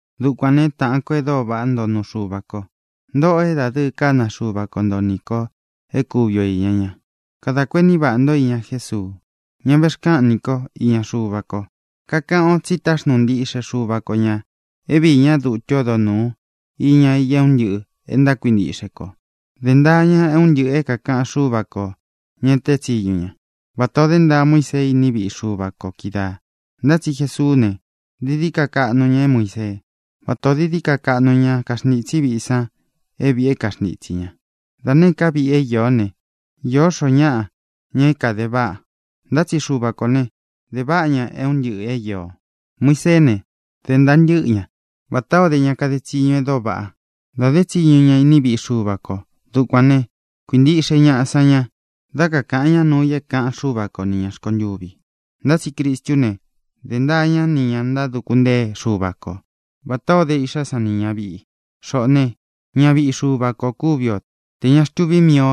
Dukuān né, taꞌan ko e dóo vaꞌá nto nuu Xuva ko, ntōꞌo é dadɨɨ kána Xuva ko nto nī ko é kuvi o īña ñá, kadā kuení vaꞌā ntó iña Jésuu, ñá vexkáꞌan ni ko īña Xuva ko. Kakaꞌan o tsi táxnuu ntiꞌxe Xuva ko ñā é viī ñá dutu ódo nūu iña i é un ntɨꞌɨ̄ e ntákuintiꞌxe kō. Dē ntaa ña é un ntɨꞌɨ̄ é kākaꞌan Xúva kō, ña é teé tsiñu ña, vatā o dé ntaa Muísee iní viꞌi Xuva kō kídaā. Ntá tsi Jesuú ne, dií dií ka kaꞌnu ña é Muīsee, vátā ó dií dií ka kaꞌnu ñá kaxntītsí viꞌi san é vīꞌi é kaxntitsī ña. Da nēé ka viꞌi é īó ne, īó xoo ñáꞌa, ña é kāde váꞌa. Ntá tsi Xuva kō ne, de váꞌa ña é un ntɨꞌɨ̄ é īo. Muiseé ne, dē ntaa ntɨ́ꞌɨ ña, vatā ó de ña kade tsiñu e dóo vaꞌá, dā dé tsiñu ña iní viꞌi Xuva kō. Dukuān né, kuīntiꞌxe ñaꞌa san ña dá kakāꞌan ñá nuu i é kāꞌan Xúva ko ni ñā rkontuvi. Ntá tsi Cristú ne, dē ntaa ñá nī ña ntáduku ntée Xuva ko vatā ó de iꞌxá san ni ñāviꞌi i. Xoꞌō né, ñaviꞌi Xuva kō kúvi o tē ña xtuví mii ō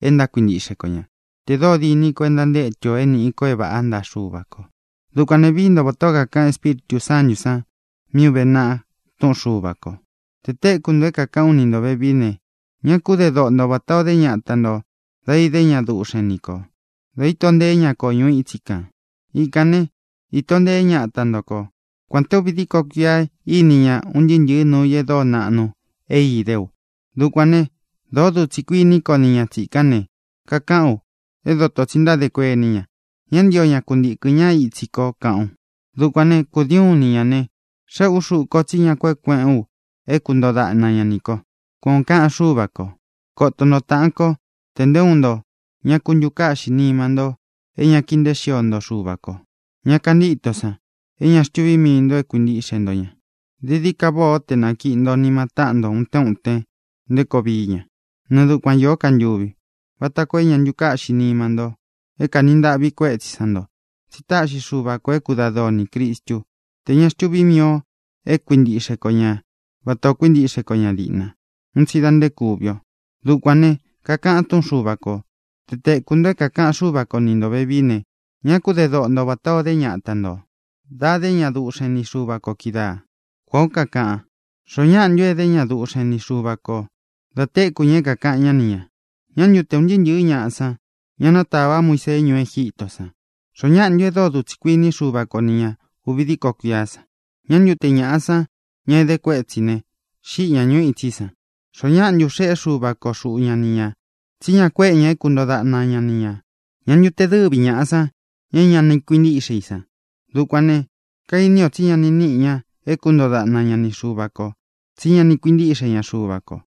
e ntákuintiꞌxe ko ña, tē dóo diní kō e ntantétu ō é nīꞌi ko é vāꞌá ntaꞌa Xuva kō. Dukuān ne, vií nto vatā ó kakaꞌan Espíritū Sántū san mí ūve naꞌa túꞌun Xuva kō: Te tēku nto é kākaꞌán u ni ntō vevií ne, ñá ku de doꞌo nto vatā o dé ñata ntō dá idé ña duꞌxen nī ko, da íto nteé ña ko ñuu itsí kān. Ikān né, īto nteé ñata ntō kó, kuān té uvi díko kuia íni ña un ntɨɨ́ ntɨ̄ɨ́ nuu i e dóo naꞌnu é idé u. Dukuān né, dōo dutsi kuiní ko nī ña tsikán ne, kakaꞌán u: “É dōto tsi ntádē kuení ña; ña ntío ña kuntīkɨn ña itsí ko”, kaꞌán u. Dukuān né, kūdiin ú ni ñā ne, xéꞌē ú xuꞌú ko tsí ña kueꞌe kueꞌén u é kuntoo daꞌna ña nī ko, kuan ō kaꞌan Xúva kō. Kōto nto, táꞌān kó, te nté uun nto ña ku ntukáꞌxi nima nto é ña kii nteé xio nto Xuva kō, ña kantíto san, é ña xtuví mii ntō é kuīntiꞌxe nto ña. Dií dií ka váꞌā ó te nakiī ntó nima taꞌan nto utén utén nté koo vií ña, nɨɨ dukuan īó ka ntuvi, vata koo é ña ntukáꞌxī nima nto é kanī ntaꞌvi kuétsi san nto. Tsí taꞌxi Xuva kō é kudadɨɨ o nī Cristú, tē ña xtuví mii ō é kuintiꞌxe ko ña vatā o kuíntiꞌxe ko ña dīꞌna, un tsi da nté kuvi o. Dukuān ne, kakaꞌan túꞌun Xuva kō: Te tēku nto é kākaꞌan Xúva ko ni ntō vevií ne, ñá ku de doꞌo nto vatā o dé ñata ntō dá idé ña duꞌxen ni Xuva kō kídaā, kuān ó kakaꞌan. ¿Xoó ñaꞌa ntu edé ña duꞌxen ni Xuva kō da téku ña é kākaꞌan ñá ni ñā? ¿Ñā ntu te un ntɨɨ́ ntɨ̄ɨ́ ñaꞌa san, ña nátava Muísee ñuú Egítō san? ¿Xoó ñaꞌa ntu e dóo dutsi kuiní Xuva ko ni ña ūvi díko kuia san? ¿Ñā ntu te ñaꞌá san, ña é edé kuetsí ne, xīꞌi ña ñuu itsí san? ¿Xoó ñaꞌa ntu xéꞌe Xuva ko xūꞌu ñá ni ñā tsí ña kuéꞌe ña é kuntoo daꞌna ña ni ñā? ¿Ñā ntu te dɨvi ñaꞌá san, ña é ña ni kuintíꞌxe i san? Dukuān né, kaini o tsí ña ni níꞌi ña é kuntoo daꞌna ña ni Xuva kō, tsí ña ni kuintíꞌxe ña Xuva kō.